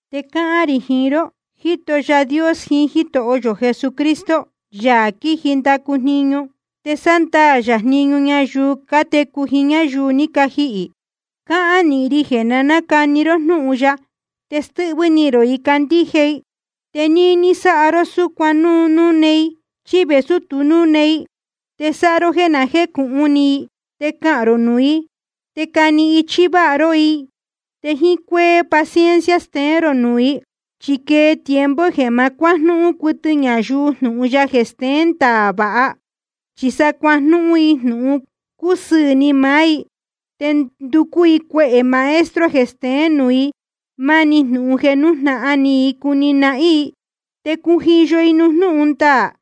Te cáhán rī jiín ró, jíto Yaā Dios jiín Jítoho yō Jesucristo, Yaā quiji ndacu jniñu, te sándaā yā jniñu ñayuu cátecu jiín ñáyuu ní cajihī. Cáhán nīhin ri jeē na nácani ró jnúhun ya, te stɨ́hvɨ́ ni rō i candíje i. Te níní sáha ró súcuan núu núne i chí vēsú tu núne i. Te sáha ró jéē na jécūhun ni i, te cahān rō nuū i, te cani ichí váha ró i, te jíín cuéhē paciencia steén rō nuū i. Chi quee tiempo jeē ma cuájnúhún cuɨtɨ ñayuu jnūhun ya jeē steén ndaā vāha, chi sa cuajnúhún i jnūhun cúsɨɨ̄ ni maá i, te nducú i cuehē maestro jeē steén nuū i máni jnūhun jeē nújnahan ni i cuni nahín i. Te cujiyo i nuū jnúhun ndaā,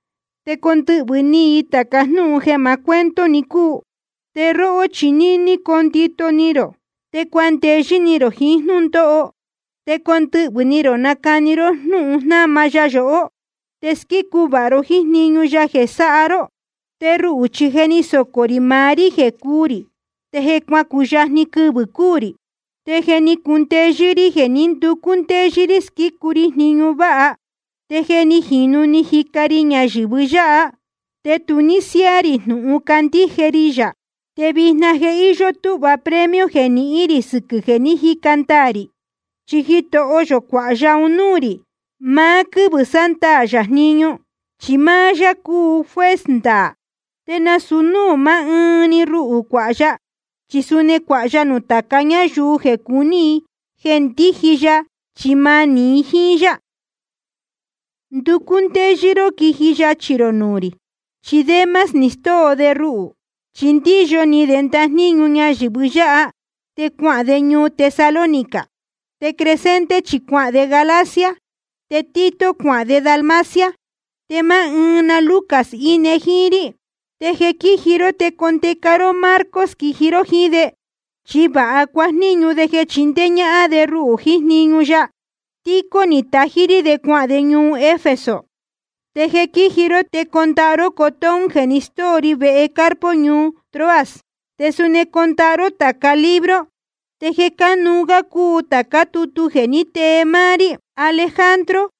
te condɨhvɨ̄ ni i tāca jnúhun jeē maá cuento‑ni cúu. Te róhó chi níní coo ndito ni rō, te cuandeyɨ́ ni rō jiín jnúndóho, te condɨhvɨ̄ ni rō nacani ró jnúhun jnáma ya yohó, te squícu vāha ró jíín jniñu ya jeē sáha ró. Te ruhū chi je ni socō rī maá rí jeē cúū rī, te je cuacuyajni quɨvɨ̄ cuu rī. Te je ni cundeyɨ́ rí jeē ní nducú ndéyɨ́ rí sɨquɨ̄ jníñu váha, te je ni jīnu ni jica ri ñayɨ̄vɨ yáha, te tu ní siáá rī jnūhun cándíje ri yā. Te vijna je íyó túhva premio jeē nihín rī sɨquɨ̄ jeē ní jica ndaā rī. Chi Jitoho yō cuāha ya un núū rī maá quɨ́vɨ̄ sándaā yā jniñu, chi máá yá cúu juez ndaā. Te nasūu núū maá ɨɨn ruhū cuāha ya, chi suni cuāha ya nuū tāca ñáyuu jeē cúu ni i jeē ndíji ya chi manī i jíín yá. Nducú ndéyɨ́ ró quiji yachī rō nuū rī. Chi Demas ni stóo de ruhū, chi ndíyo ni de ndajníñu ñayɨ̄vɨ yáha, te cuahān de ñuu Tesalónica. Te Crescente chi cuahān de Galacia, te Tito cuahān de Dalmacia. Te máá ɨɨn na Lucas íne jíín rí. Te jeē quíji ró, te condeca ró Marcos quiji ró jíín de, chi vāha cuajníñu de jeē chindéé ñáhán de ruhū jiín jniñu ya. Tíquico ni tají rí de cuahān de ñuu Efeso. Te jeē quíji ró, te condaha ró cotón jeē ni stóo ri vehe Carpo ñuu Troas. Te suni condaha ró tāca libro, te jeē cánuú gá cúu tācá tutu ní tee máá rí. Alejandro,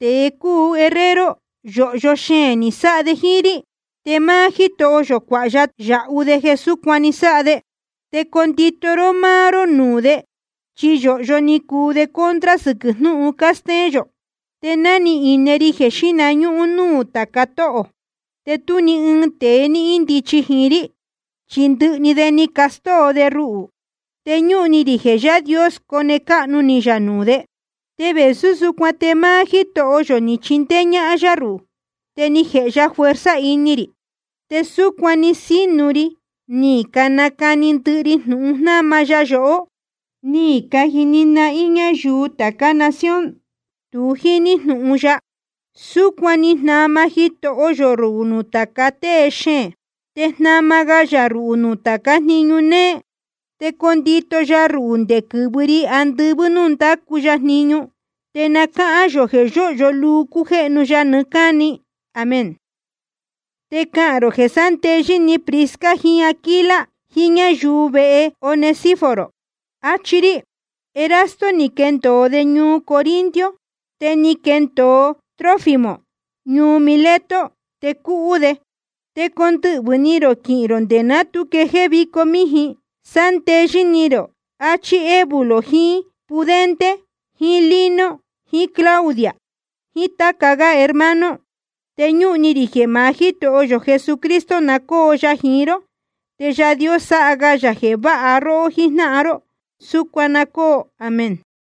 tēe cúu herrero, yōhyo xeēn ni sáha de jíín rí. Te máá Jítoho yō cuāha ya yāhu de jeē súcuan ní sáha de. Te condito ró máá ró nuū de, chi yōhyo ni cuu de contra sɨquɨ̄ jnúhun cástéén yó. Te ná ni ine ri jeē xíhna ñúhún núū tāca tóhō, te tú ni ɨɨn tēe ní índichi jiín rí, chi ndɨhɨ de ni castóo de ruhū. Te ñúhun ni rī jeē Yaā Dios cone cáhnu ni yā nuū de. Te vēsú súcuan te máá Jítoho yō ni chindéé ñáhán yá ruhū, te ni jēhe ya fuerza ini rī, te súcuan ni sínu ri ni nacani ndɨhɨ ri jnūhun jnáma ya yohó, ni cajini nahín ñáyuu tācá nación tu jíní jnūhun ya. Súcuan ni jnama Jitoho yō ruhū nuū tāca tée xeēn. Te jnama ga yā ruhū nuū tācá jniñu néé, te condito ya ruhū nde quɨ̄vɨ ri andɨvɨ́ núū ndácu ya jniñu. Te na cáhán yō jeē yóhyo luu cújéhnu ya nɨɨ́ cáni. Amén. Te cahān rō jeē sándeyɨ́ ni Prisca jiín Aquila, jiín ñáyuu vehe Onesíforo, achí rí. Erasto ni quendōo de ñuu Corinto. Te ni quendōo Trófimo ñuu Mileto, te cúhú de. Te condɨhvɨ̄ ni rō quiji ró nde ná tu quejéé vico míjin. Sándeyɨ́ ni rō, achí Eubulo jiín Pudente jiín Lino jiín Claudia jiín táca gá hermano. Te ñúhun ni rī jeē maá Jítoho yō Jesucristo na cóo ya jiín ró, te Yaā Dios sáha ga yā jeē váha róhó jíjnáhan ró. Súcuan na cóo. Amén.